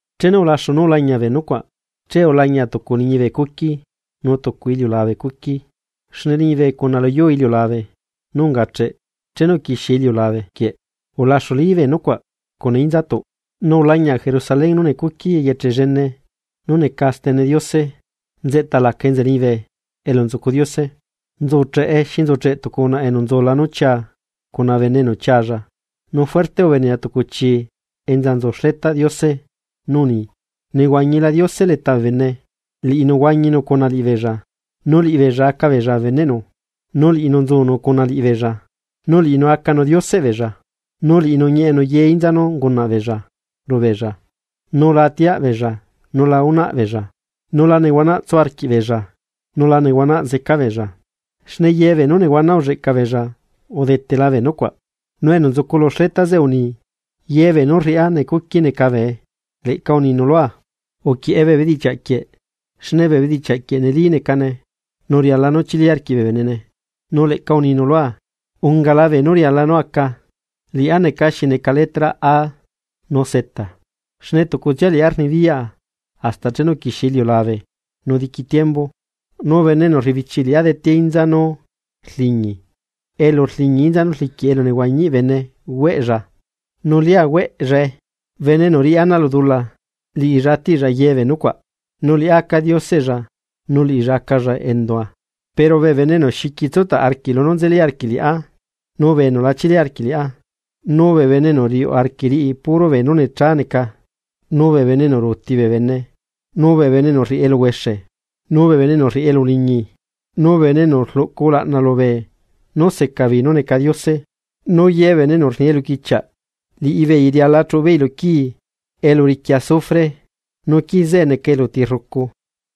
Chenu ulaxu nú ulañia bee nucuaꞌ, che ulañia tucu liñibe cuqui nu tucu iliulabe cuqui, xne liñibe cuna luyuu iliulabe nú ungacheꞌ chenu uquixie iliulabe quieꞌ ulaxuli bee nucuaꞌ cuna inzatuꞌ. Nu ulañia Jerusalén nú necuqui eyeche llene nú neca stene Diose nzeꞌta laca enza liñibe elu nzucu Diose. Nzucheꞌe xi nzucheꞌ tucu unaꞌa enu nzula nú chiaa cuna bene enu chialla. Nu fuerte ubenea tucu chi enza nzu xletaꞌ Diose, nú uni: ―Nehuañila Diose leta bee bene. Liꞌinu huañinu cuna liꞌibeella, nu liꞌibeella aca beella bee beneꞌnu, nu liꞌinu nzunu cuna liꞌibeella nu liꞌinu acanu Dioseꞌ beella. Nu liꞌinu ñieꞌenu ye inza nú ungunaꞌ beella lubeella, nu la atiaꞌbeella nu la unaꞌbeella, nu la nehuanaꞌ tsu arquiꞌbeella nu la nehuanaꞌ zeca beella, xne ye beenú nehuana ulleꞌca beella udetela bee nucuaꞌ. Nu enu nzucu lu xleta zeꞌe uni: ―Ye beenú rriaꞌa necuqui neca bee. Leꞌca uninu lua: ―Uquieꞌe bee bedichiaꞌ quieꞌ, xne bee bedichiaꞌ quieꞌ neli necane nu riala nú chili arquiꞌ bee benene. Nu leꞌca uninu lua: ―Ungala beenú riala nú aca. Liꞌá neca xi neca letra A nu Z xne tucutsia liꞌá rnibiyaꞌa hasta chenu uquixie iliulabe nu diqui tiembu. Nu bene enu rrebichiꞌ liꞌá detea inza nú rliñi elu rliñi inza nú rliquiꞌ elunehuañiꞌ bene hueꞌlla nu lia hueꞌllae. Bene enu riꞌi ana lu dula, liꞌilla atiꞌlla ye bee nucuaꞌ. Nu liꞌá aca Dioseꞌlla nu liꞌilla acalla endua. Pero bee bene enu xiqui tsutaꞌ arquiꞌ lunú nzeli arquiꞌ liꞌá, nu bee enu la chili arquiꞌ liꞌá, nu bee bene enu riuꞌ arquiꞌ riꞌi puro beenú necha neca, nu bee bene enu ruuti bee bene, nu bee bene enu rriꞌi eluhuexe, nu bee bene enu rriꞌi elu uliñi, nu bee bene enu rluꞌcu ulaꞌna lubee nú seca beei nú neca diose, nu ye bee bene enu rni eluquichiaꞌ liꞌibeei riala chuꞌubeei lu quii elu riqui azufre nu quii zeꞌe neca eluti rrucu.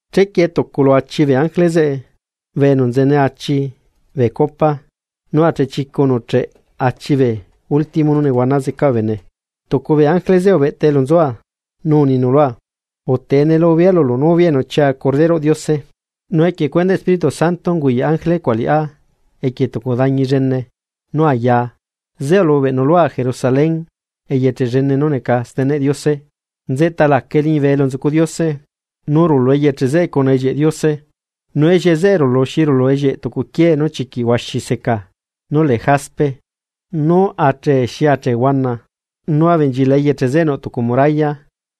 Chequie tucu lu achi bee ángele zeꞌe bee enu nzene achi bee copa nú achechicu nuꞌcheꞌ achi bee último castiya nú zeca bee bene, tucu bee ángele zeꞌe ubeꞌta elu nzua, nu uninu lua: ―Utee ne lubea lulu novia enu chiaa Corderoꞌ Diose. Nu equie cuendaꞌ Espíritu Santo unguyaꞌ ángele cuaꞌ liꞌá equie tucu dañi llene, nú ayaa. Zeꞌe ulubeꞌnu lua Jerusalén eyeche llene nú neca steneꞌ Diose nzeꞌta lacae liñibe elu nzucu Diose. Nu rulu eyeche zeꞌe cuna ellieꞌ Diose. Nu ellieꞌe zeꞌe rulu xi rulu ellieꞌ tucu quiee nú chiquiꞌ huaxi seca nú lee jaspe, nu achee xi achee huana. Nu abenchilaꞌ eyeche zeꞌe nuꞌ tucu muralla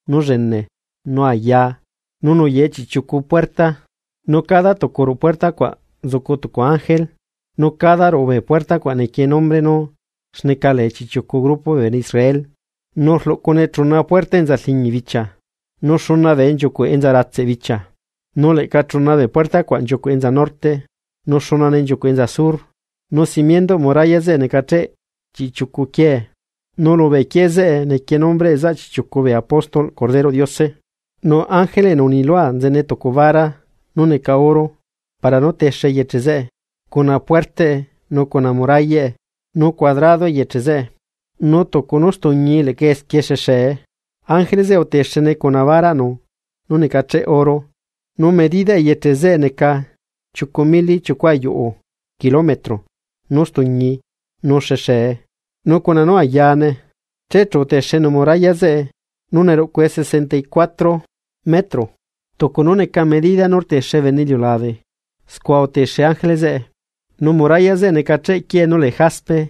nú llene nu aya nu nuyaꞌe chiꞌchiucu puerta, nu cada tucu ruꞌu puerta cuaꞌ nzucu tucu ángele, nu cada ruꞌu bee puerta cuaꞌ nequie nombre nú xneca lee chiꞌchiucu grupo bee bene Israel. Nu rluꞌcune chuna puerta enza rliñi bichia, nu xuna bee nchiucuꞌ enza ratseꞌ bichia, nu leꞌca chuna bee puerta cuaꞌ nchiucuꞌ enza norte, nu xunane nchiucuꞌ enza sur. Nu simiendoꞌ muralla zeꞌe necacheꞌ chiꞌchiucu quiee. Nu lubee quiee zeꞌe nequie nombreꞌ zaꞌ chiꞌchiucu bee apóstolꞌ Corderoꞌ Diose. Nu ángele enu uni lua nzene tucu vara nú neca oro para nú texenu eyeche zeꞌe, cuna puertaꞌe nu cuna murallaꞌe. Nu cuadrado eyeche zeꞌe, nu tucu nú stuñii leꞌca esquie xexee. Nu ángele zeꞌe utexene cuna baraꞌnu nú necacheꞌ oro, nu medidaꞌ eyeche zeꞌe neca chiucu mili chiucu ayuꞌu kilometro nú stuñii, nu xexee, nu cuna nú ayane. Che chu utexenu muralla zeꞌe, nu neruꞌcue sesenta y cuatro metros tucu nú neca medida nú rtexe bene iliulabe, scua utexe ángele zeꞌe. Nu muralla zeꞌe necacheꞌ quiee nú lee jaspe,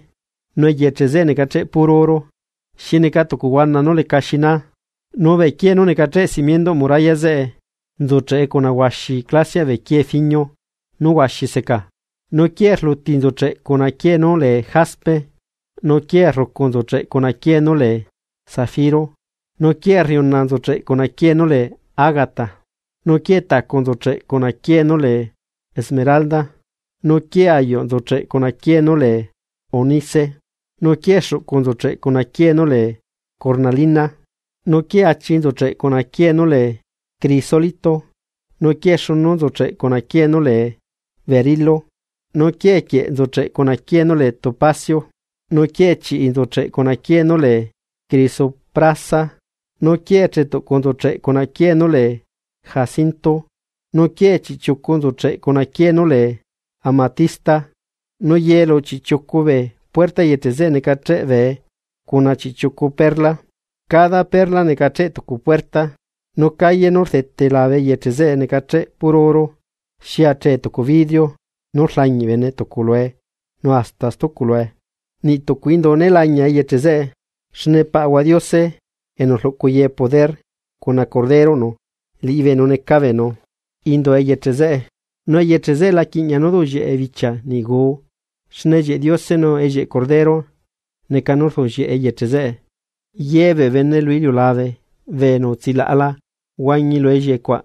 nu eyeche zeꞌe necacheꞌ puro oro, xi neca tucu huana nú leca xinaa. Nu bee quiee nú necacheꞌ simienduꞌ muralla zeꞌe nzucheꞌe cuna huaxi clasiaꞌ bee quiee fiñio nú huaxi seca. Nu quiee rluti nzucheꞌ cuna quiee nú lee jaspe, nu quiee rrucu nzucheꞌ cuna quiee nú lee zafiro, nu quiee rriuna nzucheꞌ cuna quiee nú lee ágata, nu quiee tacu nzucheꞌ cuna quiee nú lee esmeralda. Nu quiee ayuꞌ nzucheꞌ cuna quiee nú lee ónice, nu quiee xuꞌcu nzucheꞌ cuna quiee nú lee cornalina, nu quiee achi nzucheꞌ cuna quiee nú lee crisólito, nu quiee xunu nzucheꞌ cuna quiee nú lee berilo, nu quiee quieꞌ nzucheꞌ cuna quiee nú lee topacio, nu quiee chiꞌi nzucheꞌ cuna quiee nú lee crisoprasa, nu quiee chetuꞌcu nzucheꞌ cuna quiee nú lee jacinto, nu quiee chiꞌchiucu nzucheꞌ cuna quiee nú lee amatista. Nu ye lu chiꞌchiucu bee puertaꞌ eyeche zeꞌe necacheꞌ bee cuna chiꞌchiucu perla, cada perla necacheꞌ tucu puerta. Nu calle nú rdete labe eyeche zeꞌe necacheꞌe puro oro, xi achee tucu vidrio nú rlañiꞌ bene tucu lue nu hasta stucu lue. Niꞌ tucu indu né lañia eyeche zeꞌe, xne Paꞌahua Diose enu rluꞌcu ye poder cuna Corderoꞌnu liꞌibeenu neca beenu indu eyeche zeꞌe. Nu eyeche zeꞌe la quiꞌñia nú duꞌllieꞌe bichia niꞌ guu, xne ellieꞌ Diose nu ellieꞌ Corderoꞌnu neca nú rduꞌllieꞌe eyeche zeꞌe. Ye bee bene lu iliulabe bee enu utsilaꞌala huañi lu ellieꞌe cuaꞌ,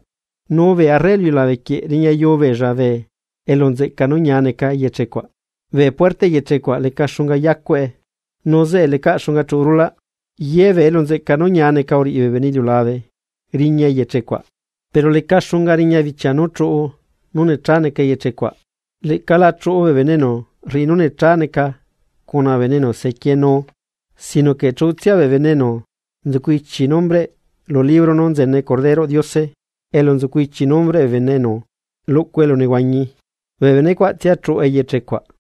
nu bee arre lu iliulabe quieꞌ riñayuu beella bee elu nzeꞌca nú ñia neca eyeche cuaꞌ. Bee puerta eyeche cuaꞌ leca xunga yacueꞌe, nu zeꞌe leca xunga chuꞌu rulaꞌ. Ye bee elu nzeꞌca nú ñia neca uriꞌi bee bene iliulabe riña eyeche cuaꞌ. Pero leca xunga riña bichia nú chuꞌu nú necha neca eyeche cuaꞌ, leꞌca la chuꞌu bee bene enu rriꞌi nú necha neca cuna bee bene enu sequienu, sino que chuꞌutsia bee bene enu nzucu ichi nombreꞌ lu libro nú nzene Corderoꞌ Diose elu nzucu ichi nombreꞌ bee bene enu luꞌcu elunehuañi, bee bene cuaꞌtsia chuꞌu eyeche cuaꞌ.